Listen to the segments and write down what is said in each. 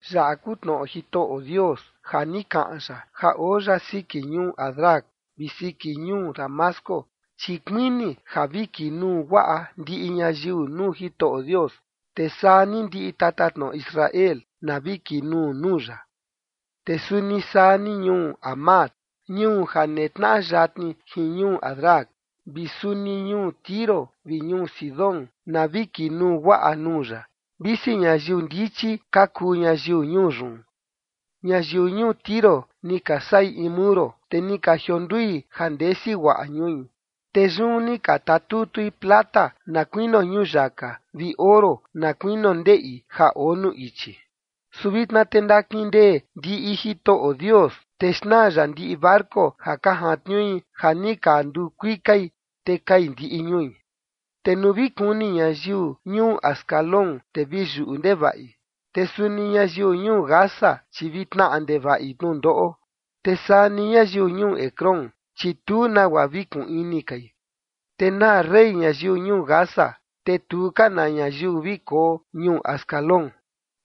Yaꞌa kuu tnoꞌo Jitoꞌo Dios ja ni kaꞌan ya ja oo ya siki ñuu Hadrac vi siki ñuu Damasco. Chi kuini ja vi kinuu guaꞌa ndiꞌi ñayiu nuu Jitoꞌo Dios, te saa ni ndiꞌi tatatnoꞌo Israel na vi kinuu nuu ya. Te suni saa ni ñuu Hamat, ñuu ja netnaꞌa yatni jin ñuu Hadrac, vi suni ñuu Tiro vi ñuu Sidón, na vi kinuu guaꞌa nuu ya, visi ñayiu ndichi ka kuu ñayiu ñuu yun. Ñayiu ñuu Tiro ni ka saꞌi in muro, te ni ka jiondui ja ndesi guaꞌa ñui, te yun ni ka tatutui plata na kuinio ñuyaka, vi oro na kuinio ndeꞌi ja oo nuu ichi. Su vitna te ndakindee ndiꞌi Jitoꞌo Dios, te xnaa ya ndiꞌi barco ka jantniui ja ni ka nduu kuikai, te kai ndiꞌi ñui. Te nuu vi kuni ñayiu ñuu Ascalón, te vi yuꞌu ndevaꞌi. Te suni ñayiu ñuu Gaza, chi vi tnaꞌa ndevaꞌi tnundoꞌo, te saa ni ñayiu ñuu Ecrón, chi tu nagua vi kuun ini kai. Te naa rey ñayiu ñuu Gaza, te tu ka na ñayiu vi koo ñuu Ascalón.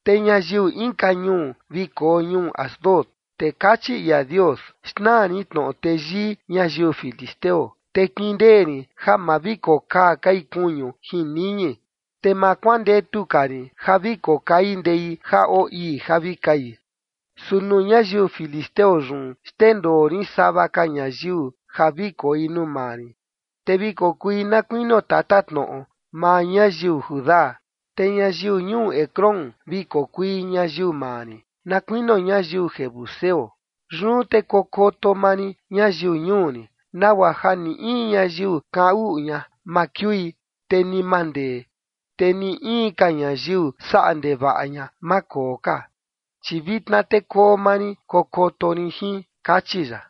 Te ñayiu inka ñuu vi koo ñuu Asdod, te kachi ia Dios: “Xnaa rin tnoꞌo teyii ñayiu filisteo. Te kindee rin ja ma vi kokaa kai kuñu jin niñi, te ma kuandetu ka rin ja vi kokai ndei ja oo ii ja vi kai. Su nuu ñayiu filisteo yun xndendoo rin sava ka ñayiu ja vi koi nuu maa rin, te vi kokui na kuinio tatatnoꞌo maa ñayiu Judá. Te ñayiu ñuu Ecrón vi kokui ñayiu maa rin, na kuinio ñayiu jebuseo. Yun te kokoto maa rin ñayiu ñuu rin, nagua ja ni in ñayiu kaꞌan uꞌu ña ma kiui, te ni ma ndee, te ni in ka ñayiu saꞌa ndevaꞌa ña, ma koo ka, chi vitna te koo maa rin kokoto rin jin”, kachi ya.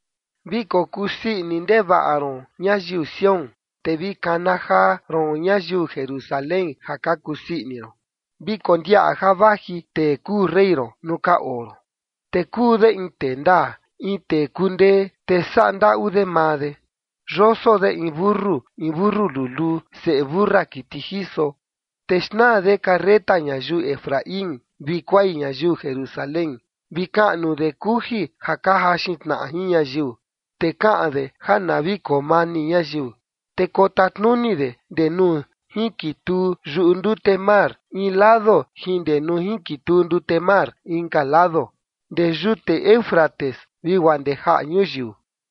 Vi kokuu sii ini ndevaꞌa ron, ñayiu Sión, te vi kana jaa ron ñayiu Jerusalén ja ka kusii ini ron. Vi kondiaꞌa ja vaji tee kuu rey ron nuu ka oo ron, te kuu de in tee ndaa, in tee kundee, te saꞌa ndaꞌu de maa de. Yoso de in mentu, in mentu luluu, seꞌe mentu siꞌi kiti jiso. Te xnaa de carreta ñayiu Efraín, vi kuai ñayiu Jerusalén, vi kaꞌnu de kuji ja ka jaxin tnaꞌa jin ñayiu, te kaꞌan de ja na vi koo mani ñayiu, te kotatnuni de ndee nuu jinkituu yuꞌu ndute mar in lado jin ndee nuu jinkituu ndute mar inka lado, ndee yute Éufrates vi guaa ndee jaꞌa ñuyiu.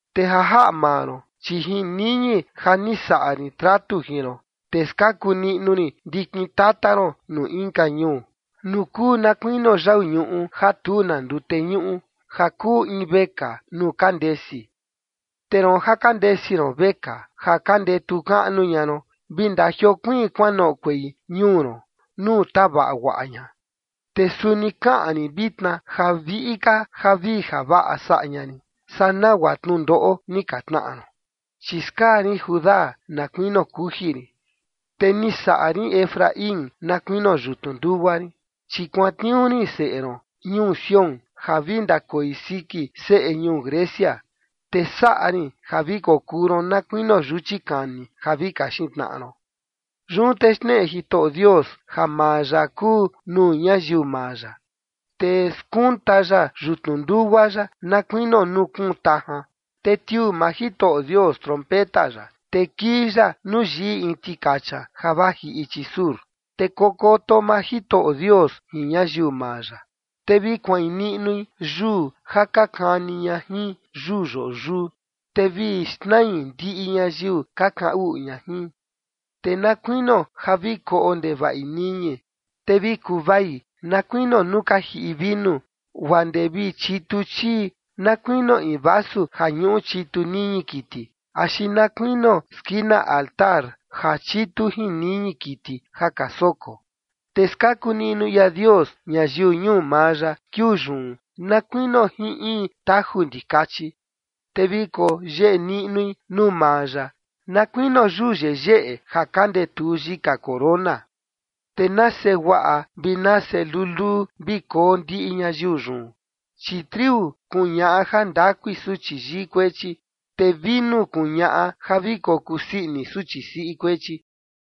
Te ja jaꞌa maa ron, chi jin niñi ja ni saꞌa rin tratu jin ron, te skaku niꞌnu rin ndikin tata ron nuu inka ñuu nuu kuu na kuinio yau ñuꞌu ja tu na ndute ñuꞌu, ja kuu in vekaa nuu ka ndesi. Te roon ja ka ndesi ron vekaa, ja ka ndetu kaꞌnu ña ron, vi ndajiokuiin kuanoꞌokuei ñuu ron nuu tavaꞌa guaꞌa ña. Te suni kaꞌan rin vitna ja viꞌi ka javii javaꞌa saꞌa ña rin saa nagua tnundoꞌo ni ka tnaꞌa ron. Chi skaa rin Judá na kuinio kuji rin, te ni saꞌa rin Efraín na kuinio yutnu ndugua rin. Chi kuantniuu rin seꞌe ron ñuu Sión ja vi ndakoi siki seꞌe ñuu Grecia, te saꞌa rin ja vi kokuu ron na kuinio yuchi kani ja vi kaxin tnaꞌa ron. Yun te xneꞌe Jitoꞌo Dios ja maa ya kuu nuu ñayiu maa ya, te skunta ya yutnu ndugua ya na kuinio nuu kuun tajan, te tiuu maa Jitoꞌo Dios trompeta ya, te kii ya nuu yiꞌi in tikacha ja vaji ichi sur. Te kokoto maa Jitoꞌo Dios jin ñayiu maa ya. Te vi kuain niꞌnui yuu ja ka kani ña jin yuu yoꞌo yuu, te vi xnai ndiꞌi ñayiu ka kaꞌan uꞌu ña jin, te na kuinio ja vi koꞌo ndevaꞌi niñi, te vi kuvai na kuinio nuu ka jiꞌi vinu, guaa ndee vi chitu chii na kuinio in vasu ja ñuꞌu chitu niñi kiti, axi na kuinio skina altar ja chitu jin niñi kiti ja ka soko. Te skaku niꞌnu ia Dios ñayiu ñuu maa ya kiuu yun na kuinio jin in taju ndikachi, te vi koyeꞌe niꞌnui nuu maa ya na kuinio yuu yeyeꞌe ja ka ndetuu yika corona. Te nase guaꞌa vi nase luluu vi koo ndiꞌi ñayiu yun, chi triu kuñaꞌa jandakui suchi yii kuechi, te vinu kuñaꞌa ja vi kokusii ini suchi siꞌi kuechi.